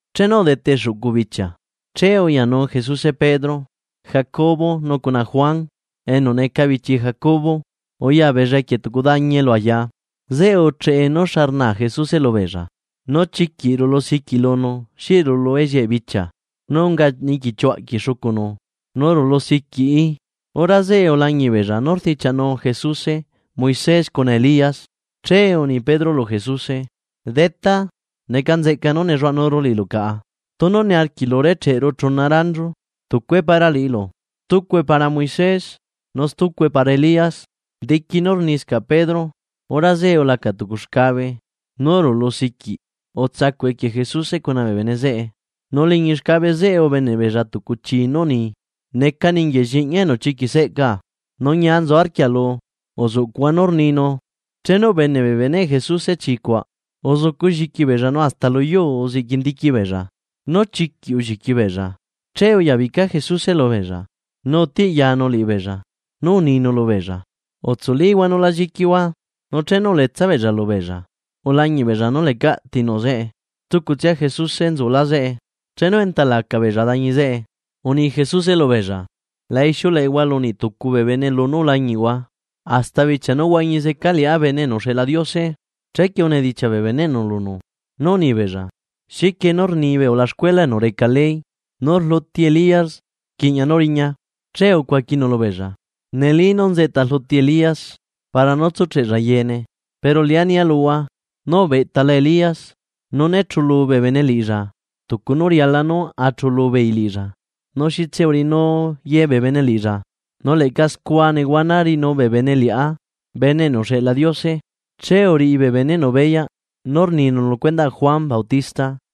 Chenu udete xuꞌcu bichia, che uyanu Jesuse Pedro, Jacobo nu cuna Juan enu neca bichi Jacobo uya beella equie tucu dañi elu aya, zeꞌe ucheꞌe nú xa rnaa Jesuse lubeella. Nu chiquiꞌ rulu siquiꞌ lunu xi rulu ellieꞌe bichia, nu unga niquichuaꞌquieꞌ xucunu nu rulu siquiꞌi. Hora zeꞌe ulañiꞌ beella nú rdichiaꞌnu Jesuse Moisés cuna Elías. Che uni Pedro lu Jesuse: ―Detá, ¡neca nzeꞌca nú nelluaꞌanuru liꞌilu caꞌa! Tunu niarquiꞌlu recheꞌru chuna ranchu: tucue para liꞌilu, stucue para Moisés nu stucue para Elías. Diqui nú rniscaꞌ Pedro, hora zeꞌe ulaca tucu xcabe nú rulusiquiꞌ utsacuꞌ equie Jesuse cuna bee bene zeꞌe. Nu liñi xcabe zeꞌe ubeneꞌ beella tucu chii nú uni: ―Neca ninguieꞌ Lliꞌñia enu chiquiꞌ seꞌcaa. Nu ñia nzu arquialu, uzuꞌcuꞌhua nú rninu. Chenu ubeneꞌ bee beneꞌ Jesuse chi cuaꞌ, uzucu lliqui beella nu hasta luyuu uziꞌquindiqui beella, nu chiquiꞌ ulliqui beella. Che uyabica Jesuse lubeella, nu utiꞌyanu liꞌibeella nu uninu lubeella: ―Utsulíhua, nu la lliquihua. Nu chenu uletsa beella lubeella ulañiꞌ beella nú lecaꞌ tinuꞌ zeꞌe, stucutsia Jesuse nzulá zeꞌe. Chenu enta laca beella dañi zeꞌe, uni Jesuse lubeella: ―La ixiuleꞌehua lu niꞌtucu bee bene lunú ulañiꞌhua, hasta bichia nú huañi zeca Liꞌá Bene enu uxeꞌla Diose. Chequie unedichiaꞌ bee beneꞌnu lunu nú uni beella: ―¿Xiquie nú rni bee ulaxcuela enu reca ley nú rluti Elías rquiꞌña nú riña? Che ucuaquinu lubeella: ―Neli nú nzeꞌta rluti Elías para nú tsucheꞌlla yeene. Pero Liꞌá nia luhua nú ubeꞌtala Elías, nu né chulu bee bene liꞌilla tucu nú riala nú a chulu beei liꞌilla, nu xitse uriꞌinu ye bee bene liꞌilla. Nu leꞌca scua nehuana riꞌinu bee bene Liꞌá Bene enu uxeꞌla Diose. Che uriꞌi bee beneꞌnu beyaꞌ nú rninu lu cuendaꞌ Juan Bautista.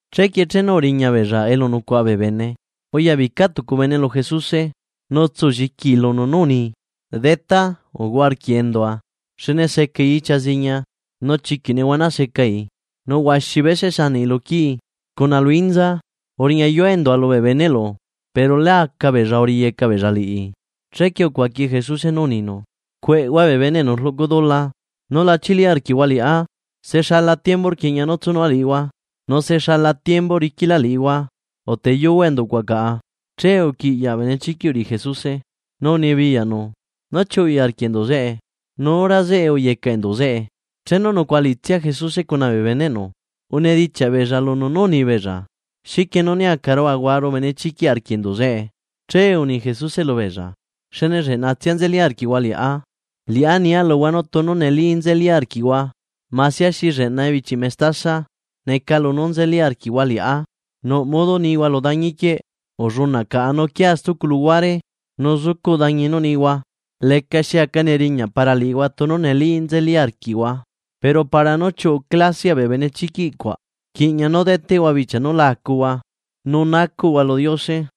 Chequie chenu uriña beella elu nucuaꞌa bee bene, uyabica tucu bene lu Jesuse nu utsulliquii lunu nú uni: ―Detá, uhuaꞌa arquiꞌ endua xne secai ichia ziña nu chiquiꞌ nehuana secai, nu huaxi bese sanaꞌi lu quii, cuna lu inza. Uriñayua endua lubee beneꞌlu, pero lá aca beella riyeca beella liꞌi. Chequie ucuaqui Jesuse nú uninu: ―¡Cueꞌhua bee bene enu rluꞌcu dula núla chili arquiꞌhua liꞌá! ¿Se xala tiembu rquiꞌña nú tsunua liꞌihua?, nu ¿se xalalá tiembu riquilá liꞌihua? Uteyuhua enduꞌcuaꞌ caꞌa. Che uquiꞌyaꞌ benechiquiꞌ uriꞌi Jesuse nu unibiyaꞌnu nú chiuꞌui arquiꞌ enduꞌ zeꞌe, nu hora zeꞌe uyecaꞌ enduꞌ zeꞌe. Chenu nucuaꞌa liꞌitsia Jesuse cuna bee beneꞌnu unedichiaꞌ beella lunu nú uni beella: ―¿Xiquie nú né acaru ahuaru benechiquiꞌ arquiꞌ enduꞌ zeꞌe? Che uni Jesuse lubeella: ―Xne lleꞌnatsia nzeli arquiꞌhua Liꞌá. Liꞌá nia luhua nú tunu neli nzeli arquiꞌhua masia xi lleꞌna ebichi mestasa, neca lunú nzeli arquiꞌhua Liꞌá, nuꞌ modo nihua lu dañiquieꞌ: “Ullunaꞌ caꞌa nu uquia stucu luhuare”; nu zucuꞌ dañi nú nihua. Lecaxi aca neriñaꞌ para liꞌihua tunu neli nzeli arquiꞌhua. Pero para nú chiuꞌu clasiaꞌ bee benechiquiꞌ cuaꞌ, rquiꞌña nú deteꞌhua bichia núla acuhua, nu nacuꞌhua lu Diose.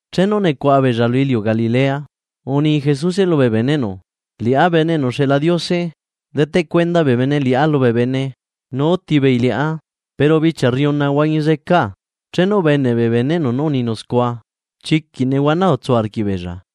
Chenu nucuaꞌa beella lu iliu Galilea, uni Jesuse lubee beneꞌnu: ―Liꞌá Bene enu uxeꞌla Diose deteꞌ cuenda bene liꞌá lubee bene, nu uti beei liꞌá, pero bichia rriuna huañi zecaa. Chenu ubeneꞌ bee beneꞌnu nú uninu scua chiquiꞌ nehuana utsu arquiꞌbeella.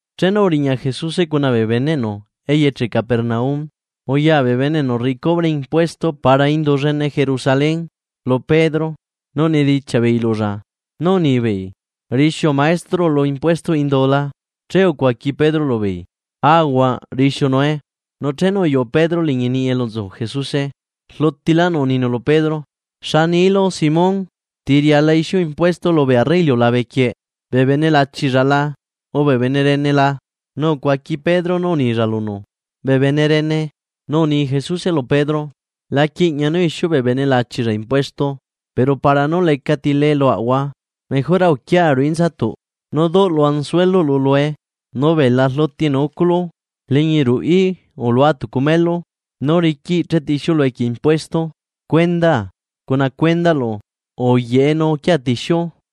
Chenu uriña Jesuse cuna bee beneꞌnu eyeche Capernaum, uya bee bene enu rriꞌi cubre impuesto para indu llene Jerusalén lu Pedro nu unidichiaꞌ beei lulla, nu unibeei: ―¿Rixiu maestroꞌlu impuestoꞌ indu la? Che ucuaqui Pedro lubeei: ―Aahuaꞌ rixiunue. Nu chenu uyuꞌu Pedro liñi niꞌi elu nzu Jesuse, rlutilánu uninu lu Pedro: ―¿Xa nilu, Simón? ¿Ti riala ixiu impuesto lubee arre iliulabequieꞌ: bee bene lachilla la, o bee bene rene la? Nu ucuaqui Pedro nú unilla lunu: ―Bee bene rene. Nu uni Jesuse lu Pedro: ―La quiꞌña nú ixiu bee bene lachilla impuesto. Pero para nú lecati lee luaꞌahua, mejora uquia ruꞌu inzatuꞌ, nu duꞌlu anzueluꞌlu lue, nu bela rluti enu uculu. Liñi ruꞌí ulua tucu melu nú riquiꞌ chetixiulu equie impuesto, cuendaa cuna cuendaꞌlu, uyaꞌe nu uquia tixiu.